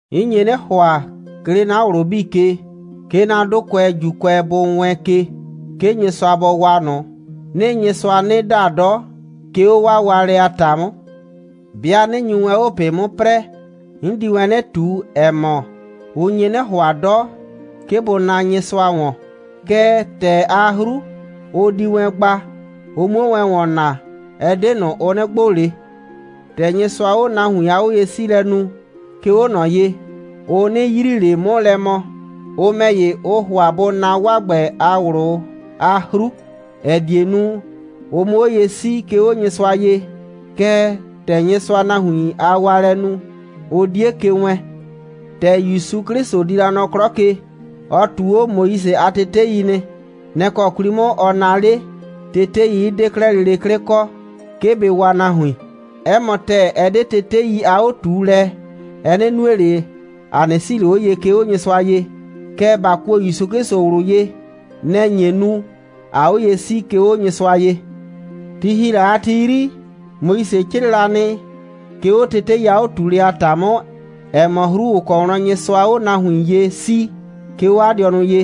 'N nye 'nɩ ‑hʋa, 'ke 'le 'na ꞊wlʋ 'bii ke, 'ke 'na 'dʋkʋɛ ‑Juukʋɛ bʋ wɛɛn ke, 'ke Nyɩsʋa bɔ waa ꞊nʋ. 'Nɩɩ Nyɩsʋa 'nɩ da 'dɔ, 'ke 'o 'waa waalɛ a ‑ta 'mʋ. 'Bɩa 'nɩ nyu wɛn 'o ꞊pɩ 'mʋ 'prɛɛ, 'n di wɛn 'nɩ ꞊tu, ‑ɛ mɔ, ʋ nye 'nɩ ‑hʋa 'dɔ, 'ke bʋ naa Nyɩsʋa ‑wɔn, kɛɛ, ‑tɛɛ a 'hru, ʋ di wɛn gba, ʋ 'muo wɛn ‑wɔn na, ɛ 'de ꞊nʋ, ʋ 'nɩ gbʋ ꞊le. ‑Tɛ Nyɩsʋaa 'o nahuin a 'oye'siilɛ nu, 'ke 'o ꞊nɔ ye, ʋ 'nɩ yrii ꞊le 'mʋ lɛ mɔ. Ʋ ‑mɛ ‑ye, ʋʋ ‑hʋa bʋ na 'waa ‑gbɛ a ꞊wlʋ a 'hru, ‑ɛ die nu, ʋ 'mʋ 'o ye 'sii, 'ke 'o Nyɩsʋa ye. Kɛɛ, ‑tɛ Nyɩsʋaa nahuin a waalɛ nu, ʋ 'die ke wɛɛn. ‑Tɛ ‑Yusu 'Klɩsʋ di la nɔ 'klɔ ke, ɔ ꞊tuu 'o Moise a tetei nɩ. Nɛ‑ kɔ 'kwli 'mʋ, ɔ naa 'le, tetei 'ɩ 'de kɛ lele 'klɩ kɔ, 'ke bɩ waa nahuin. 'Ɛ mɔ ‑tɛɛ, ɛ 'de tetei a 'o꞊tuulɛ, ɛ 'nɩ nue ꞊le, ‑a 'nɩ 'sii ꞊le 'o ye, 'ke 'o Nyɩsʋa ye, kɛɛ, ‑ba kuo ‑Yusu 'Klɩsʋ ꞊wlʋ ye, nɛ‑ nye nu, ꞊aa 'o ye 'sii, 'ke 'o Nyɩsʋa ye. Ti ‑hi la a ti 'yri, Moise 'crɩɩ la nɩ, 'ke 'o tetei a 'o꞊tuulɛ a ‑ta 'mʋ, ‑ɛ mɔ 'hru, ‑ʋ kɔ wlɔn Nyɩsʋaa 'o nahuin ye 'sii, 'ke 'o 'a dɩɔnʋ ye.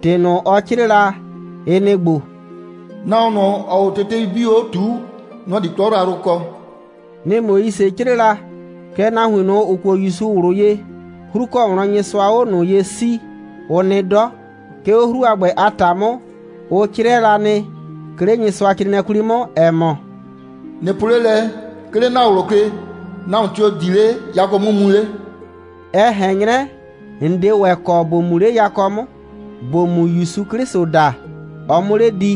‑Tɩ ꞊nʋ, ɔ 'crɩɩ la, ɩ nɩ‑ ‑gbo: «Nahuon ꞊nʋ, ‑ɔɔ 'o tetei 'bii 'o ꞊tuu, nɔ‑ di 'klɔ yrayrʋ kɔ.» Nɩ‑ Moise 'crɩɩ la. Kɛɛ, nahuin ꞊nʋ, ‑ʋ kuo ‑Yusu ꞊wlʋ ye, 'hru ‑kɔ wlɔn Nyɩsʋaa 'o ꞊nʋ ye 'sii, ʋ nɩ 'dɔ. 'Ke 'o 'hru a ‑gbɛ a ‑ta 'mʋ, ʋ 'crɩɛ la nɩ, 'ke 'le Nyɩsʋacrɩɩnɩɛ 'kwli 'mʋ, ‑ɛ mɔ: «꞊Nɩ po 'le lɛ, 'ke 'le ‑na ꞊wlʋ ke: Nahuon tio‑ di 'le yakɔ 'mʋ mu 'le?» ɛ ꞊hɛn 'nyrɛ, ‑n 'de ‑wɛ kɔ ‑bo mu 'le yakɔ 'mʋ, ‑bo mu ‑Yusu 'Klɩsʋ da, ɔ 'mʋ 'le di,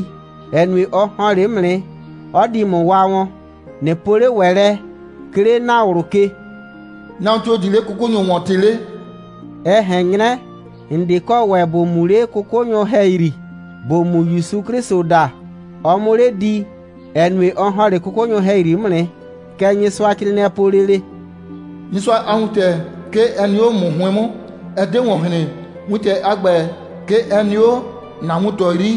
‑ɛ nue, ɔ ‑hɔn 'le 'mʋ nɩ, 'ɔ di ‑mʋ waa wɔn. ꞊Nɩ po 'le ‑wɛ lɛ, 'ke 'le ‑na ꞊wlʋ ke: «Nahuon tio‑ di 'le 'kʋkʋnyʋ ‑wɔn ꞊tɩ 'le?» ɛ ꞊hɛn 'nyrɛ, ‑n 'de kɔ ‑wɛ ‑bo mu 'le 'kʋkʋnyʋ ‑hɛyri, ‑bo mu ‑Yusu 'Klɩsʋ da, ɔ 'mʋ 'le di, ‑ɛ nue, ɔ ‑hɔn 'le 'kʋkʋnyʋ ‑hɛyri 'mʋ nɩ. Kɛ Nyɩsʋacrɩɩnɩɛ po lele: «Nyɩsʋa a wintɛ, 'ke ɛ nɩ 'o ‑mʋ 'hʋɩn 'mʋ, ɛ 'de ‑wɔn hren. Wintɛ a ‑gbɛ, 'ke ɛ nɩ 'o ‑na wuntɔ 'yri,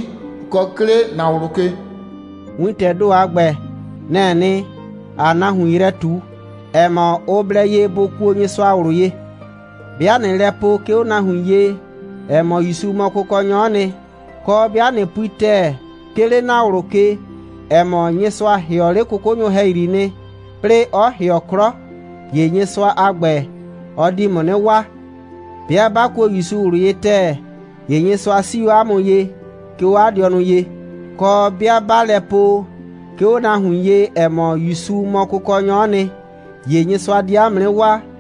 kɔ 'ke 'le ‑na ꞊wlʋ ke.» Wintɛɛ ‑do a ‑gbɛ, nɛ‑ɛ nɩ, ‑aa nahuin yrɛ ꞊tu, ‑ɛ mɔ, ʋ blɛ ye bʋ kuo Nyɩsʋa ꞊wlʋ ye. 'Bɩa ꞊nɩɩ lɛ po, 'ke 'o nahuin ye, ‑ɛ mɔ, ‑Yusu mɔ Kʋkɔnyɔ'ɔ nɩ, kɔ, 'bɩa ꞊nɩ pui ‑tɛɛ, 'ke 'le ‑na ꞊wlʋ ke, ‑ɛ mɔ, Nyɩsʋa ‑hɩɔ 'le 'kʋkʋnyʋ ‑hɛyri nɩ, 'plɩɩ 'ɔ ‑hɩɔ 'klɔ, ‑ye Nyɩsʋa a ‑gbɛ, ɔ di ‑mʋ 'nɩ waa. 'Bɩa ꞊ba kuo ‑Yusu ꞊wlʋ ye ‑tɛɛ, ‑ye Nyɩsʋa 'sii 'o ‑a mʋ ye, 'ke 'o 'a dɩɔnʋ ye. Kɔ, 'bɩa ꞊baa lɛ po, 'ke 'o nahuin ye, ‑ɛ mɔ, ‑Yusu mɔ Kʋkɔnyɔ'ɔ nɩ, ‑ye Nyɩsʋa di ‑a mʋ 'nɩ waa.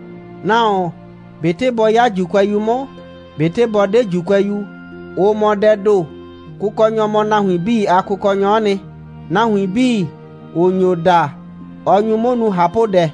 Nahuon, ꞊betɩ bɔ 'ya ‑Juukʋɛyu 'mʋ, ꞊betɩ bɔ 'de ‑Juukʋɛyu, ʋ mɔ dɛɛ ‑do. Kʋkɔnyɔ mɔ nahuin 'bii a Kʋkɔnyɔ'ɔ nɩ. Nahuin 'bii, ‑ʋ nyo da, ɔ nyu 'mʋ nu ꞊hapʋdɛ,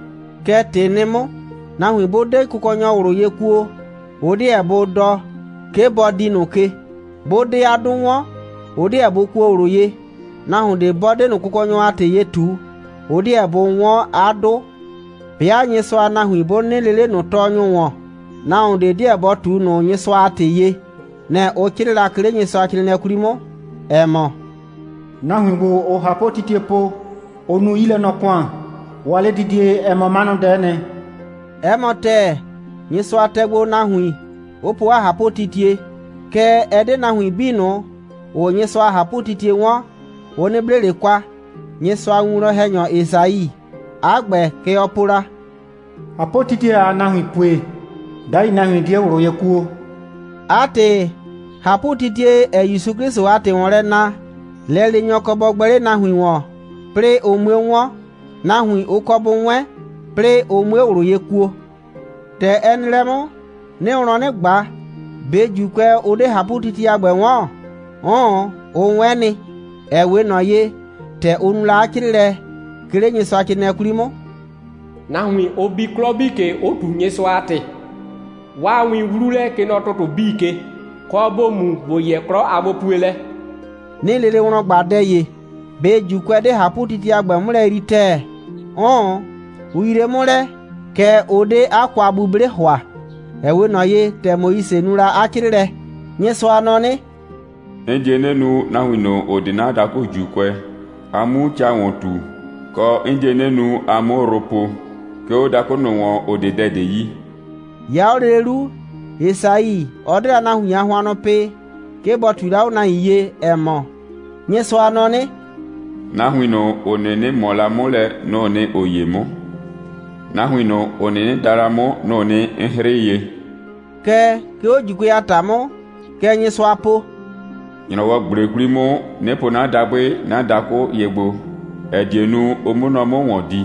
Kɛ ‑tɩ nɩ 'mʋ. Nahuin 'bʋ 'de Kʋkɔnyɔ ꞊wlʋ ye kuo, ʋ 'deɛ bʋ dɔ, 'ke bɔ dii ꞊nʋ ke. 'Bʋ 'de 'a 'dʋ 'wɔn, ʋ 'deɛ bʋ kuo ꞊wlʋ ye. Nahuon ꞊de 'bɔ 'de ꞊nʋ Kʋkɔnyɔ a ‑tɩ ye ꞊tu, ʋ 'deɛ bʋ 'wɔn 'a 'dʋ. 'Bɩa Nyɩsʋa a nahuin 'bʋ 'nɩnɩ lee 'le ꞊nʋ tɔɔnyʋ ‑wɔn, nahuon ꞊de 'deɛ bɔ ꞊tu ꞊nʋ Nyɩsʋa a ‑tɩ ye. Nɛ‑ ʋ 'crɩɩ la, 'ke 'le Nyɩsʋacrɩɩnɩɛ 'kwli 'mʋ, ‑ɛ mɔ: «Nahuin ‑gbo, ‑ʋʋ ꞊hapʋtitie po, ʋʋ nu 'yilɛnɔ‑kʋan, 'waa 'ledidie, ɛ mɔ 'manʋdɛ'ɛ nɩ.» 'Ɛ mɔ ‑tɛɛ, Nyɩsʋa tɛ gbo nahuin, 'ʋ po 'a ꞊hapʋtitie. Kɛɛ, ɛ 'de nahuin 'bii ꞊nʋ, ‑ʋʋ Nyɩsʋa a ꞊hapʋtitie 'wɔn, ʋ 'nɩ 'ble ꞊le kwa. Nyɩsʋa a winwlɔn‑hɛnyɔ Esai, 'a ‑gbɛ, kɛ ɔ po la: «꞊Hapʋtitie, ‑aa nahuin pue, 'dai nahuin 'die ꞊wlʋ ye kuo.» 'A ‑tɩ, ꞊hapʋtitie, ‑ɛɛ ‑Yusu 'Klɩsʋ a ‑tɩ ‑wɔn lɛ na, lɛleenyɔ kɔ bɔ gbɛ 'le nahuin ‑wɔn, 'plɩɩ ʋ 'mue 'wɔn. Nahuin, ʋ kɔ bʋ 'wɛn, 'plɩɩ ʋ 'mue ꞊wlʋ ye kuo. ‑Tɛ ɛ nɩ lɛ 'mʋ, 'nɩɩ wlɔn 'nɩ ꞊gba: ꞊Be ‑Juukʋɛ, ʋ 'de ꞊hapʋtitie a ‑gbɛ 'wɔn? 'Ʋʋn, ʋ 'wɛn nɩ, ‑ɛ 'we ꞊nɔ ye, ‑tɛ ʋ nu la 'a 'crɩɩlɛ, 'ke 'le Nyɩsʋacrɩɩnɩɛ 'kwli 'mʋ: «Nahuin, ʋ bi 'klɔ 'bii ke, 'ʋ ꞊tu Nyɩsʋa a ‑tɩ. 'Waa win 'wlu lɛ, kɛ nɔ ‑tʋtʋ 'bii ke, kɔ, ‑bo mu ‑bo yɛ 'klɔ a gbopuelɛ.» 'Nɩɩ lele wlɔn ꞊gba dɛ ‑ye: ꞊Be ‑Juukʋɛ 'de ꞊hapʋtitie a ‑gbɛ 'mʋ lɛ yrii ‑tɛɛ? 'Ʋʋn, ʋ yrie 'mʋ lɛ, kɛɛ, ʋ 'de 'a kwa'buble ‑hʋa, ‑ɛ 'we ꞊nɔ ye, ‑tɛ Moise nu la 'a 'crɩɩlɛ: «Nyɩsʋa nɔ 'nɩ: 'N die 'nɩ nu, nahuin ꞊nʋ, ‑ʋ 'de 'na dakʋ ‑Juukʋɛ, a 'mu ca ‑wɔn ꞊tu, kɔ, 'n die 'nɩ nu, a 'mʋ yrʋ po, 'ke 'o dakʋ ꞊nʋ ‑wɔn, ‑ʋ 'de dɛ ꞊de yi.» 'Ya 'o lele 'lu, Esai, ɔ 'de la nahuin a hʋannʋ pɩ, 'ke bɔ ꞊tui la 'o nahuin ye, ‑ɛ mɔ: «Nyɩsʋa nɔ 'nɩ: Nahuin ꞊nʋ, ‑ʋ 'nɩnɩ ꞊mɔ la 'mʋ lɛ, nʋ‑ʋ nɩ, ‑ʋ 'ye 'mʋ. Nahuin ꞊nʋ, ‑ʋ 'nɩnɩ da la 'mʋ, nʋ‑ʋ nɩ, 'n 'hrɩɩ ye.» Kɛɛ, 'ke 'o ‑Juukʋɛ a ‑ta 'mʋ, kɛ Nyɩsʋa po: «‑Nyrɔwɔ꞊gble 'kwli 'mʋ, 'nɩ po 'na dabʋɩ 'na dakʋ ye gbo, ‑ɛ die nu, ʋ 'mʋ nɔ 'mʋ ‑wɔn di.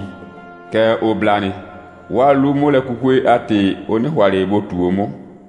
Kɛɛ, ʋ bla nɩ, 'waa 'lu'mʋlɛkukue a ‑tɩ, ʋ 'nɩ ‑hʋa ꞊le bʋ ꞊tuu 'o 'mʋ.»